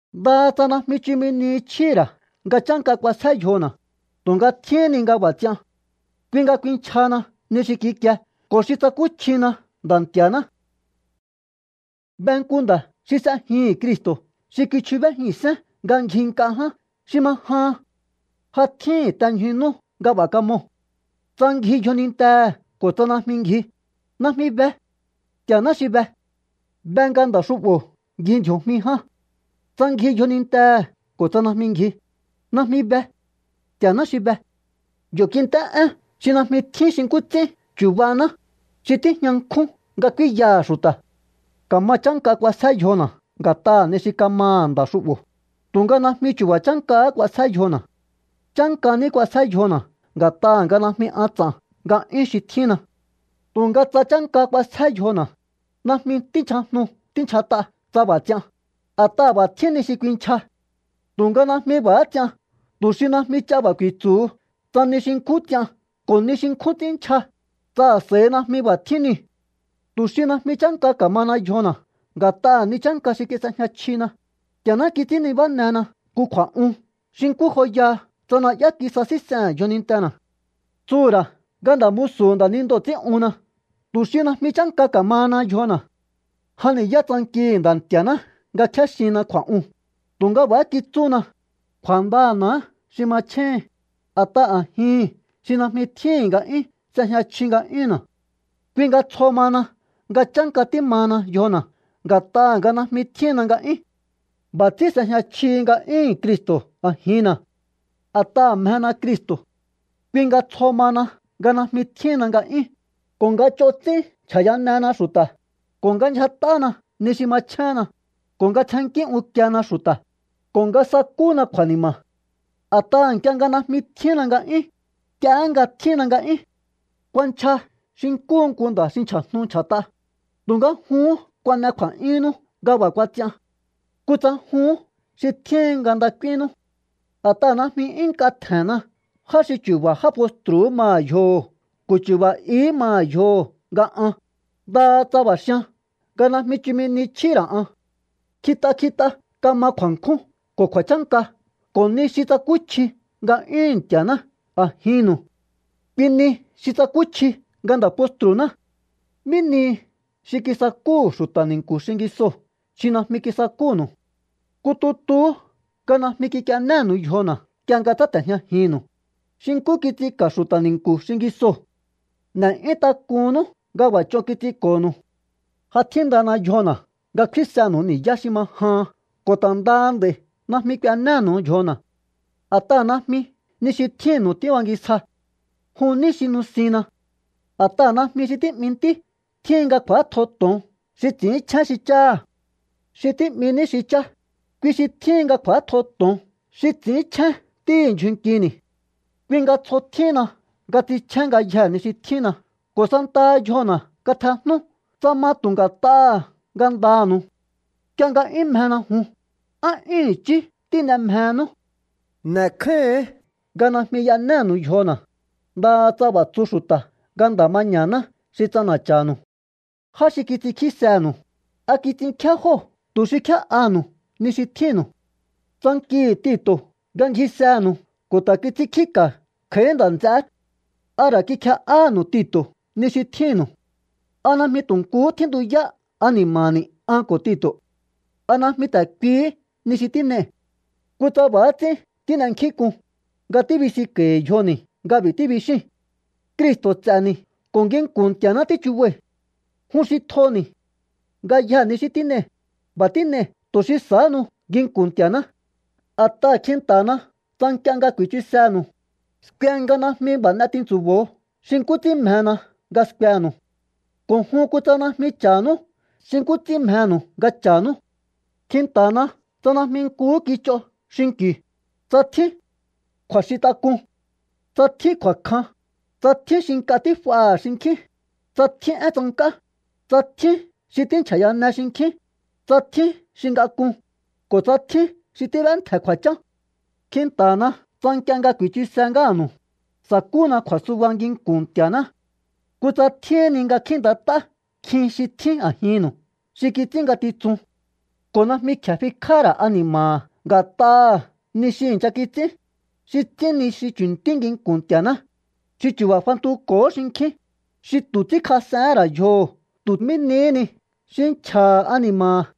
Ndaha tsa najmi chumi ni chjíhi̱ ra̱ nga chánka k'uasjé yjona̱, tu̱nga tjíhín ni nga b'a̱ ts'ian. Kui nga kuinchjahana ni xi kikie ko̱ xi tsakúchjina Nda̱ Nti̱a̱ná. Be nku nda̱ xi s'ejihi̱n Cristo̱ xi kichjubéjihi̱n sén nga ngji nk'a ján xi ma jahan. Ja tjíhi̱n te ñju nú nga b'a̱ kamoo̱. Tsa ngji yjonintehe̱ ko̱ tsa najmi ngji, najmi be. Nti̱a̱ná xi be. Be nga nda̱ xu'bo̱ ngji ndji̱o̱jmi ján. Tsa ngji yjonintehe̱ ko̱ tsa najmi ngji, najmi be. Nti̱a̱ná xi be. Yo̱ kint'é én xi najmi tjín xi nkú ts'ín chubahaná, xi tíjña nkjún nga k'úínyaha̱ xu̱ta̱. Ka̱ma chánka k'uasjé yjona̱ nga̱t'aha̱ ni xi kamaha̱ nda̱ xu'bo̱, tu̱nga najmi chu̱ba̱ chánkahá k'uasjé yjona̱. Chánka ní k'uasjé yjona̱ nga̱t'aha̱ nga najmi an ts'a̱n nga'yún xi tjínna. Tu̱nga tsa chánka k'uasjé yjona, najmi tínchjajnu tínchjat'a tsa b'a̱ ts'ian, a̱t'aha̱ b'a̱ tjín ni xi kuinchja. Tu̱nga najmi b'a̱há ts'ian tu̱ xi najmi ch'a b'a̱ ku̱i̱tsu̱hu tsa nihi xi nkjún ts'ian ko̱ nihi xi nkjún ts'ín nchja, tsa a̱s'a̱i najmi b'a̱ tjín niu̱. Tu̱ xi najmi chánka ka̱mahana yjona̱ nga̱t'aha̱ ni chánka xi kis'ejña chjina, Nti̱a̱ná kits'ín nibánena nku kju̱a̱'un xi nkú joyaha tsa na'yá kisasíns'ehe̱n yjonintena̱. Tsuhu̱ ra̱ nga nda̱ musu̱hu̱ nda̱nindoo̱ ts'ín'unna tu̱ xi najmi chánka ka̱mahana yjona̱. Jan ni̱yá tsankihi̱ Nda̱ Nti̱a̱ná nga kjéxinna kju̱a̱'uu̱n, tu̱nga b'a̱há kitsúna: “Kju̱a̱ndana̱há xi machjéhin, a̱t'aha̱ a̱jihi̱n xi najmi tjíhi̱n nga'yún s'ejña chji nga'yúnna̱.” Kui nga tsjo mahana nga chánka tímahana yjona̱ nga̱t'aha̱ nga najmi tjínna nga'yún. B'a̱ ts'ín s'ejña chjihi nga'yúhu̱n Cristo̱ a̱jinna̱. A̱t'aha̱ mjena Cristo̱, kui nga tsjo mahana nga najmi tjíhinna nga'yún, ko̱ nga ch'on ts'ín nchja̱yanena xu̱ta̱, ko̱ nga ndyjat'ána ni xi machjénna, ko̱ nga tsjennkí unkiena xu̱ta̱, ko̱ nga sakúna kju̱a̱ni̱ma̱. A̱t'aha̱ nk'ie nga najmi tjínna nga'yún, nk'iehé nga tjínna nga'yún. Kuanchja xi nkúhu nku nda̱ xi nchja̱jnu nchja̱t'a, tu̱nga juhún kuan'e kju̱a̱'yúnnú nga b'a̱ kuats'ian. Kutsa juhún xi tjíhin nga nda k'úínnú. A̱t'aha̱ najmi 'yún nk'a tje̱nna já xi chu̱ba̱ já postru̱hú maha̱ yjoho̱ ko̱ chu̱ba̱ ihí maha̱ yjoho̱ nga an, ndaha tsa b'a̱ xian nga najmi chumi ni chjíhi̱ ra̱ an. Kjit'a kjit'a kama kju̱a̱nkjún ko̱ kju̱a̱chánka ko̱ ni xi tsakúchji nga'yúhu̱n Nti̱a̱ná a̱jinnu̱u. Kui ni xi tsakúchji nga nda̱ postru̱ná. ¿Mí nihi xi kisakúhu̱ xu̱ta̱ ni̱nku̱ xingisoo̱ xi najmi kisakúnu̱u? Nku tutuhú nga najmi kik'ienénu̱u yjona̱ nk'ie nga tsáte̱jñajinnu̱u, xi nkú kits'inka̱ xu̱ta̱ ni̱nku̱ xingisoo̱. ¡N'e̱'yún tak'unnú nga b'a̱ ch'on kits'inko̱nu̱u! Ja tjíndana yjona̱ nga kfínsenu̱u ni̱yá xi ma jahan ko̱ ta̱ ndaha nd'a̱i̱ najmi k'uenénu̱u yjona̱. A̱t'aha̱ najmi ni xi tjínnu̱u tíbangisja. Jun ní xi nusinna. A̱t'aha̱ najmi xi tí'mi ntí tjíhin nga kj'u̱átjo to̱on xi ts'i̱ínchjén xi cháha̱. Xi tí'mi ní xi chá, kui xi tjíhin nga kj'u̱átjo to̱on xi ts'i̱ínchjén ntíhi̱ ndyjun nkini̱. Kui nga tsjo tjíhinna nga ts'inchjén ngayjee̱ ni xi tjínna ko̱ santaha yjona̱ katjejnú tsa ma tu̱ nga̱t'aha̱ ngandanu̱u. Nk'ie nga 'yún mjena jun, ¿á 'yún i̱chí tín'e mjehenú? N'e̱kjáíhi̱ín nga najmi y'enénu̱u yjona̱, ndaha tsa b'a̱ tsu xu̱ta̱ nga nda̱ maña̱ná xi ts'ana̱cha̱nu̱u. Já xi kits'inkjísenu̱u, ¿a kits'inkjíá jóo̱ tu̱ xi kjé'aha̱nu̱u ni xi tjínnu̱u? Tsankihi̱ Tito̱ nga ngjisenu̱u ko̱ ta̱ kits'inkjíka̱ kj'a̱í nda̱ nts'eé. ¿A ra̱ kikje'áhánu̱u Tito̱ ni xi tjínnu̱u? ¿A najmi tu̱ nkuhú tjíntuyá ani̱ma̱ni̱ an ko̱ Tito̱? ¿A najmi ta̱ kuihí ni xi tín'ei̱? Kutsa b'a̱há ts'ín tín'enkjínk'un, nga tíbisinko̱i̱ yjoni̱ nga b'i̱ tíbixíi̱n. Cristo̱ ts'e̱ni̱ ko̱ nginku̱n Nti̱a̱ná tíchubai̱. Jun xi tjoni̱. Ngayjee̱ ni xi tín'ei̱, b'a̱ tín'ei̱ tu̱ xi sahánu nginku̱n Nti̱a̱ná. A̱t'aha̱ kjinta̱hana tsa nk'ie nga ku̱i̱chusenu̱u, skue nga najmi b'a̱ n'e tintsu̱bo̱o xi nkú ts'ín mjena nga skuenu̱u. Ko̱ jun kutsa najmi cha̱hánú xi nkú ts'ín mjenu̱u nga cha̱nú. Kjinta̱hana tsa najmi nkuhú kich'o xinki̱u, tsa tjín kju̱a̱xintak'un, tsa tjín kju̱a̱kjan, tsa tjín xi nk'a tíf'aha̱ xinkjín, tsa tjín én tsank'á, tsa tjín xi tínchja̱yane xinkjín, tsa tjín xi ngak'un, ko̱ tsa tjín xi tíb'éntje̱ kju̱a̱chán. Kjinta̱hana tsa nk'ie nga ku̱i̱chuse ngáha̱nu̱u, sa̱kúna kju̱a̱suba nginku̱n Nti̱a̱ná. Kutsa tjíhín ni nga kjíi̱ntat'á nkjin xi tjín a̱jinnu̱ xi kits'ín ngatitsun ko̱ najmi kje̱e fikj'áha̱ ra̱ ani̱ma̱ha̱ nga̱t'aha̱ ni xi i̱ncha kits'ín, xi ts'ín ni xi chu̱ntí nginku̱n Nti̱a̱ná, xi chu̱ba̱ fantuko̱hó xinkjín, xi tu̱ ts'ínkjas'ehén ra̱ yjoho̱ tu̱ mí nihí ni xi nchja̱ha̱ ani̱ma̱ha̱.